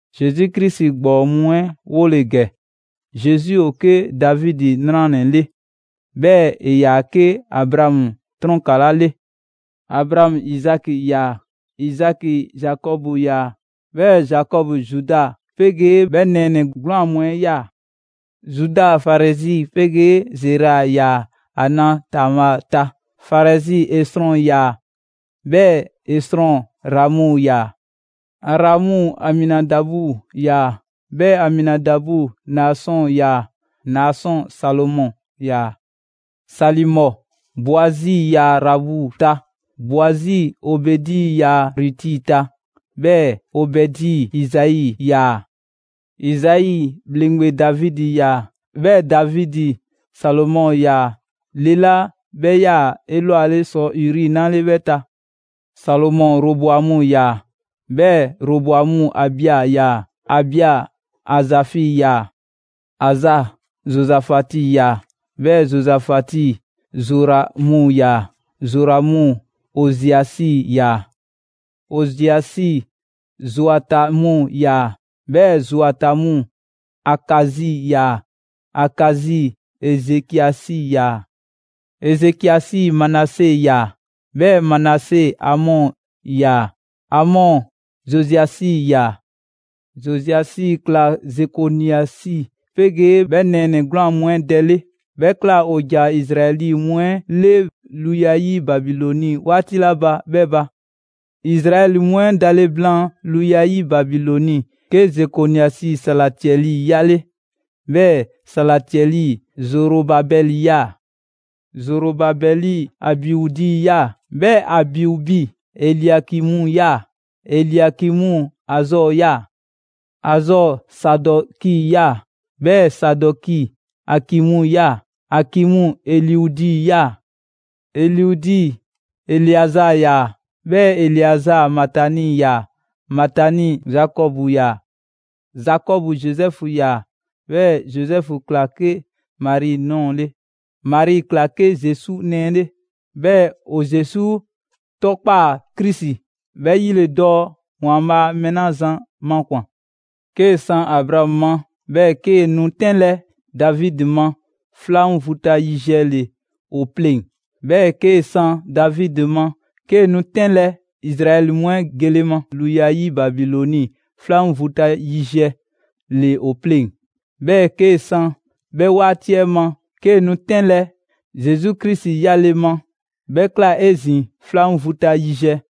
Zesu Krisi ‑gbɔɔ mu 'ɛ 'wole‑ ‑gɛ. Zesu ‑o 'ke Davidi 'nranɛ‑ 'le. 'Bhɛɛ‑ ‑e ‑yaa 'ke Abraamu 'trɔnkala 'le. Abraamu Izaki ‑yaa; Izaki Zakɔbu ‑yaa; 'bhɛɛ‑ Zakɔbu Zuda 'pegee 'bhɛ nɛɛnɛ‑ 'gwlaan‑ mu 'ɛ 'yaa‑. Zuda Farɛsi 'pegee Zera ‑yaa ‑a na Tamaa ta; Farɛsi Esrɔn ‑yaa; 'bhɛɛ‑ Esrɔn Ramu ‑yaa; Aramu Aminadabu ‑yaa; 'bhɛɛ‑ Aminadabu Naasɔn ‑yaa; Naasɔn Salimɔ ‑yaa. Salimɔ Boazi ‑yaa Raabu ta; Boazi Obɛdi ‑yaa Ruti ta; 'bhɛɛ‑ Obɛdi Izai 'yaa‑; Izai ‑bhleŋgbe Davidi 'yaa‑; 'bhɛɛ‑ Davidi Salomɔ 'yaa‑ le 'la 'bhɛ ‑yaa 'elwale ‑sɔ Uri 'na 'le 'bhɛ ta. Salomɔ Roboamu ‑yaa; 'bhɛɛ‑ Roboamu Abia ‑yaa; Abia Azafi ‑yaa. Aza Zozafati 'yaa‑; 'bhɛɛ‑ Zozafati Zoramu 'yaa‑; Zoramu Oziasi ‑yaa; Oziasi Zoatamu ‑yaa; 'bhɛɛ‑ Zoatamu Akazi ‑yaa; Akazi Ezekiasi ‑yaa; Ezekiasi Manase 'yaa‑; 'bhɛɛ‑ Manase Amɔ 'yaa‑; Amɔ Zoziasi ‑yaa; Zoziasi ꞊kla Zekoniasi 'pegee 'bhɛ nɛɛnɛ‑ 'gwlaan‑ mu 'ɛ dɛ 'le; 'bhɛ ꞊kla ‑o ‑ja Izraɛli mu 'ɛ 'le luya 'yi Babilɔni 'waati 'la ba 'bhɛɛ‑ ba. Izraɛli mu 'ɛ dale blaan luya 'yi Babilɔni, 'ke Zekoniasi Salatiɛli 'yale‑; 'bhɛɛ‑ Salatiɛli Zorobabɛli 'yaa‑; Zorobabɛli Abiudi 'yaa‑; 'bhɛɛ‑ Abiubi Eliakimu 'yaa‑; Eliakimu Azɔɔ ‑yaa; Azɔɔ Sadɔki ‑yaa; 'bhɛɛ‑ Sadɔki Akimu ‑yaa; Akimu Eliudi ‑yaa; Eliudi Eleazaa 'yaa‑; 'Bhɛɛ‑ Eleazaa Matani 'yaa‑; Matani Zakɔbu ‑yaa; Zakɔbu Zozɛfu ‑yaa; 'bhɛɛ‑ Zozɛfu ꞊kla 'ke Mari ꞊nɔɔ 'le. Mari ꞊kla 'ke Zesu nɛɛ 'le. 'Bhɛɛ‑ ‑o Zesu 'tɔkpaa‑ Krisi: 'Bhɛ 'yi ‑le dɔɔ ‑Waanbhaa' mɛɛ 'la zan makwan‑. 'Kee‑ san Abraamu ma, 'bhɛɛ‑ 'kee‑ nu 'tɛnlɛ‑ Davidi ma, 'flan vu ta yiziɛ ‑le ‑o pleŋ‑. 'Bhɛɛ‑ 'kee‑ san Davidi ma, 'kee‑ nu 'tɛnlɛ‑ Izraɛli mu 'ɛ gele ma luya 'yi Babilɔni, 'flan vu ta yiziɛ ‑le ‑o pleŋ‑. 'Bhɛɛ‑ 'kee‑ san 'bhɛ 'waati 'ɛ ma, 'kee‑ nu 'tɛnlɛ‑ Zesu Krisi 'yale‑ ma, 'bhɛ ꞊kla 'ezin‑ 'flan vu ta yiziɛ.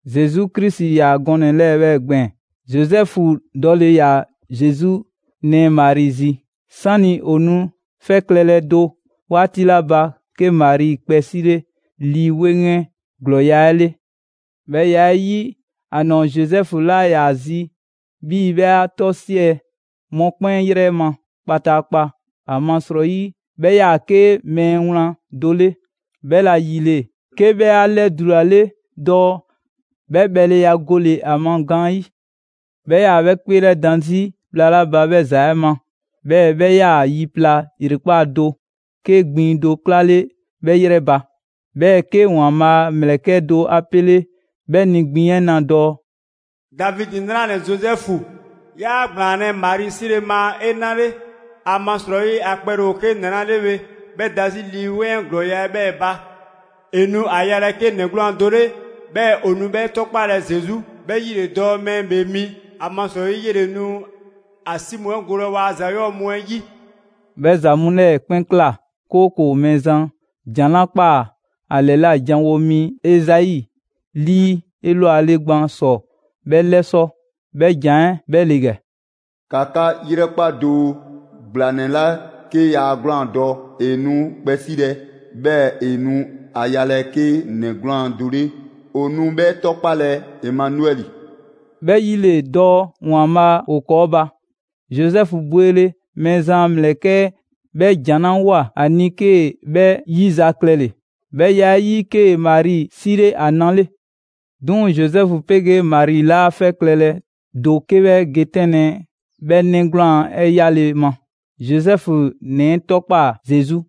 Zesu Krisi ‑yaa gɔnɛ‑ 'lɛɛ‑ 'bhɛɛ‑ gbɛɛn‑. Zozɛfu dɔle ‑yaa Zesu nɛɛ Mari zi. 'Sani‑ ‑o nu 'fɛ klɛlɛ do 'waati 'la ba, 'ke Mari kpɛ 'sile Lii 'Weŋ 'ɛ ‑glɔɔya' 'ɛ 'le. 'Bhɛ ya 'ɛ 'yi, ‑a ‑nɔɔ Zozɛfu 'laa ‑yaa ‑a zi 'bhii‑ 'bhɛ 'a 'tɔsiɛ‑ mɔkpɛn' 'yrɛ ma kpataakpa, ‑amasrɔyi 'bhɛ 'yaa‑ 'ke mɛɛ wlan do 'le. 'Bhɛla‑ ‑yile, 'ke 'bhɛ 'a 'lɛdulale dɔɔ 'bhɛ bhɛleya gole‑ ‑a ma gaanyi'. 'Bhɛ 'yaa‑ 'bhɛ 'kpeelɛdan 'zi bhla 'la ba 'bhɛ ‑za 'ɛ ma, 'bhɛɛ‑ 'bhɛ 'yaa‑ yi pla ‑yrekpaa' do, 'ke gbiŋ do 'klale 'bhɛ 'yrɛ ba. 'Bhɛɛ‑ 'ke ‑Waanbhaa' a ‑mlɛkɛ' do 'a 'pele 'bhɛ ni gbiŋ 'ɛ na dɔɔ: «Davidi 'nranɛ‑ Zozɛfu, 'yaa ‑gblaanlɛ' Mari 'sile‑ ma 'e 'na 'le; ‑amasrɔyi ‑a kpɛle ‑o 'ke ‑nɛ 'la 'le bhe, 'bhɛ da 'zi Lii 'Weŋ 'ɛ ‑glɔɔya' 'ɛ 'bhɛɛ‑ ba. ‑E nu ‑a yalɛ 'ke ‑nɛ 'gwlaan‑ do 'le, 'bhɛɛ‑ 'e nu 'bhɛ 'tɔkpalɛ Zesu, 'bhɛ 'yi ‑le dɔɔ Mɛɛ ‑Bhee Mi, ‑amasrɔyi 'yele‑ nu ‑a 'si mu 'ɛ golɛ waa ‑za 'yɔɔ‑ mu 'ɛ 'yi.» 'Bhɛ ‑za mu 'lɛɛ‑ 'kpɛn ꞊kla, 'kooko‑ Mɛɛzan ‑jan 'la ꞊kpaa ‑a ‑lɛla' janwo mi Ezai 'lii 'elwale gban ‑sɔ 'bhɛ 'lɛsɔ‑. 'Bhɛ ‑jan 'ɛ 'bhɛ ‑le ‑gɛ: ‑Ka 'ka 'yrɛkpa doo! ‑Gblanɛ 'la 'ke yaa 'gwlaan‑ dɔ, ‑e nu kpɛ 'silɛ‑, 'bhɛɛ‑ ‑e nu ‑a yalɛ 'ke ‑nɛ 'gwlaan‑ do 'le. ‑O nu 'bhɛ 'tɔkpalɛ Emanuɛli.» ('Bhɛ 'yi ‑le dɔɔ ‑Waanbhaa' ‑o ‑kɔɔ' ba.) Zozɛfu bwele, Mɛɛzan a ‑mlɛkɛ' 'ɛ 'bhɛ ‑jan 'la ꞊woa ‑a ni 'kee‑ 'bhɛ 'yizaklɛle. 'Bhɛ ya 'ɛ 'yi, 'kee‑ Mari 'sile ‑a na 'le. 'Duŋ‑ Zozɛfu 'pegee Mari 'laa 'fɛ klɛlɛ do 'ke 'bhɛ ge 'tɛnlɛ‑ 'bhɛ 'nɛ 'gwlaan‑ 'ɛ 'yale‑ ma. Zozɛfu ‑nɛ 'ɛ 'tɔkpaa‑ Zesu.